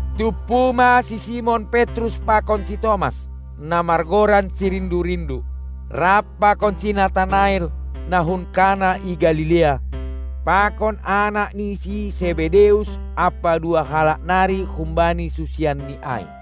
Tumpu ma si Simon Petrus pakon si Tomas, na margoran si Rindu-rindu, rap pakon si Natanael, na hun Kana i Galilea, pakon anak ni si Sebedeus ampa dua halak nari humbani susianNi ai.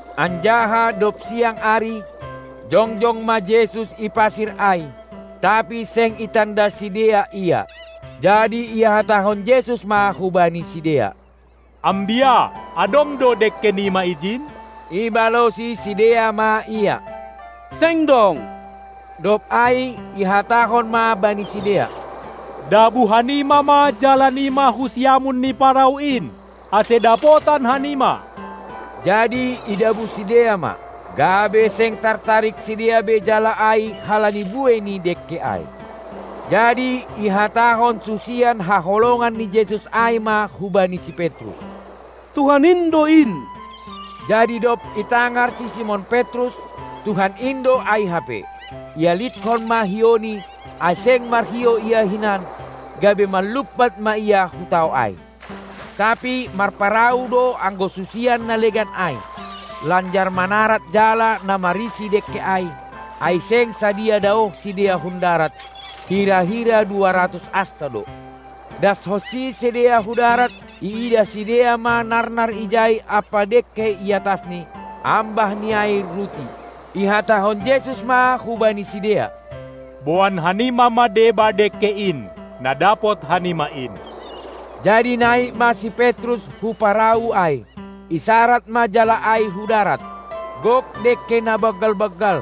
Anjaha dob siang ari, jongjong ma Jesus i pasir ai, tapi seng itanda sidea Ia. Jadi ihatahon Jesus ma hubani sidea: Ambia, adong do dengke nima ijin? Ibalosi sidea ma Ia: Seng dong! dob ai ihatahon ma bani sidea: Dabuh hanima ma jala nima hu siamun ni parau in, ase dapotan hanima! Jadi idabuh sidea ma, gabe seng tartarik sidea be jala ai halani buei ni dengke ai. Jadi ihatahon susian haholongan ni Jesus ai ma hubani si Petrus: Tuhan in do in! Jadi dob itangar si Simon Petrus, Tuhan in do ai hape, ialithon ma hiouni, ai seng marhiou ia hinan, gabe manlumpat ma ia hu tao ai. Tapi marparau do anggo susian na legan ai, lanjar manarad jala na marisi dengke ai, ai seng sadiha daoh sidea hun darat, hira-hira dua ratus asta do. Dashonsi sidea hu darat, iidah sidea ma narnar ijai ampa dengke i atasni, ambah ni ai ruti. Ihatahon Jesus ma hubani sidea: Boan hanima ma deba dengke in, na dapot hanima in! Jadi naik ma si Petrus hu parau ai, isarad ma jala ai hu darat, gok dengke na banggal-banggal,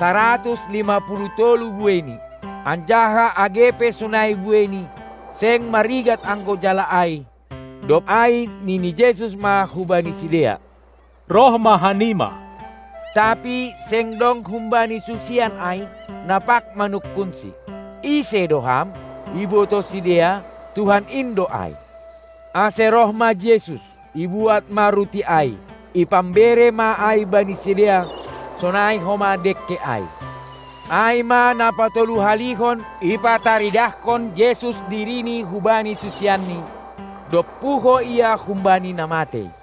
saratus lima puluh tolu bueini, anjaha age pe sonai bueini, seng marigat anggo jala ai. Dob ai nini Jesus ma hubani sidea: Roh ma hanima! Tapi seng dong humbani susian ai, na pag manungkunSi: Ise do Ham? Ibotoh sidea, Tuhan in do ai. Ase roh ma Jesus, ibuat ma ruti ai, ipambere ma ai bani sidea, sonai homa dengke ai. Ai ma na patoluhalihon ipataridahkon Jesus diriNi hubani susianNi, dob puho Ia humbani na matei.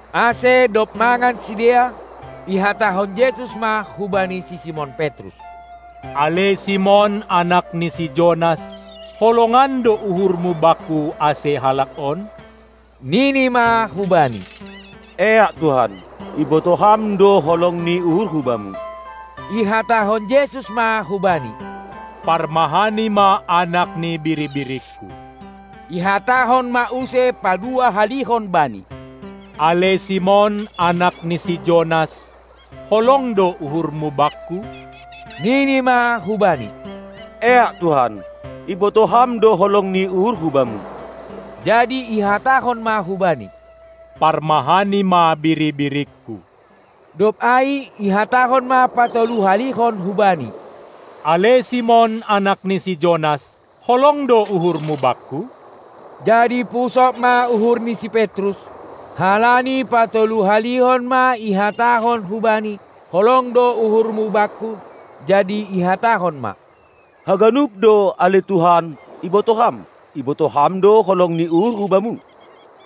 Ase dob mangan sidea, ihatahon Jesus ma hubani si Simon Petrus: Ale Simon, anak ni si Jonas, holongan do uhurMu Bakku ase halak on? Nini ma hu Bani: Eak Tuhan, ibotoh Ham do holong ni uhurhu Bamu! Ihatahon Jesus ma hubani: Parmahani ma anak ni biri-biringKu! Ihatahon ma use padua-halihon bani: Ale Simon, Anak ni si Jonas, holong do uhurmu Bakku? Nini ma hu Bani: Eak Tuhan, ibotoh Ham do holong ni uhurhu Bamu! Jadi ihatahon ma hubani: Parmahani ma biri-biringKu! Dob ai ihatahon ma patolu-halihon hubani: Ale Simon, anak ni si Jonas, holong do uhurmu Bakku? Jadi pusok ma uhur ni si Petrus, halani patolu-halihon ma ihatahon hubani: Holong do uhurmu Bakku? Jadi ihatahon ma: Haganup do, ale Tuhan, ibotoh Ham; ibotoh Ham do holong ni uhurhu Bamu!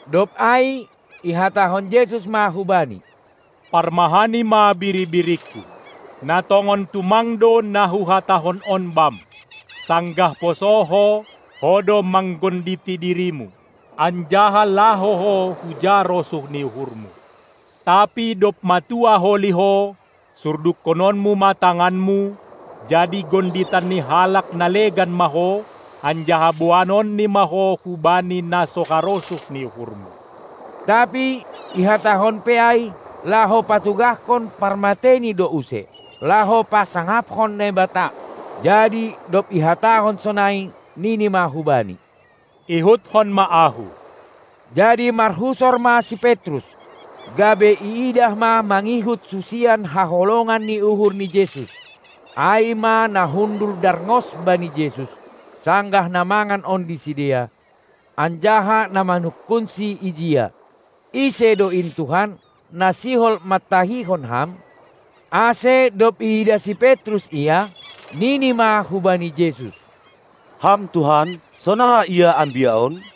Dob ai ihatahon Jesus ma hubani: Parmahani ma biri-biringKu! Na tongon tumang do na Huhatahon on bam: Sanggah poso ho, ho do manggonditi dirimu, anjaha laho ho huja rosuh ni uhurmu. Tapi dob matua holi ho, surdukkononmu ma tanganmu, jadi gonditan ni halak na legan ma ho, anjaha boanonni ma ho hubani na so harosuh ni uhurmu. Tapi ihatahon pe ai, laho patugahkon parmateini do use, laho pasangaphon Naibata. Jadi, dob ihatahon sonai, nini ma hubani: Ihutkon ma Ahu! Jadi marhusor ma si Petrus, gabe iidah ma mangihut susian haholongan ni uhur ni Jesus, ai ma na hundul darngos bani Jesus, sanggah na mangan ondi sidea, anjaha na manungkunsi ijia: Ise do in Tuhan, na sihol mantahihon Ham? Ase dob iidah si Petrus ia, nini ma hubani Jesus: Ham Tuhan, sonaha ia ambia on?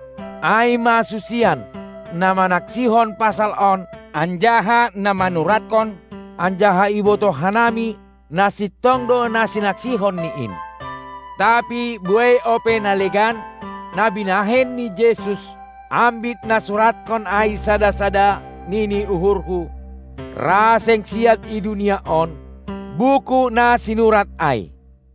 Ai ma susian, na manaksihon pasal on anjaha na manuratkon, anjaha ibotoh hanami, na sintong do na sinaksihonni in. Tapi buei ope na legan, na binahen ni Jesus; ambit nasuratkon ai sada-sada, nini uhurhu, ra seng siat i dunia on, buku na sinurat ai.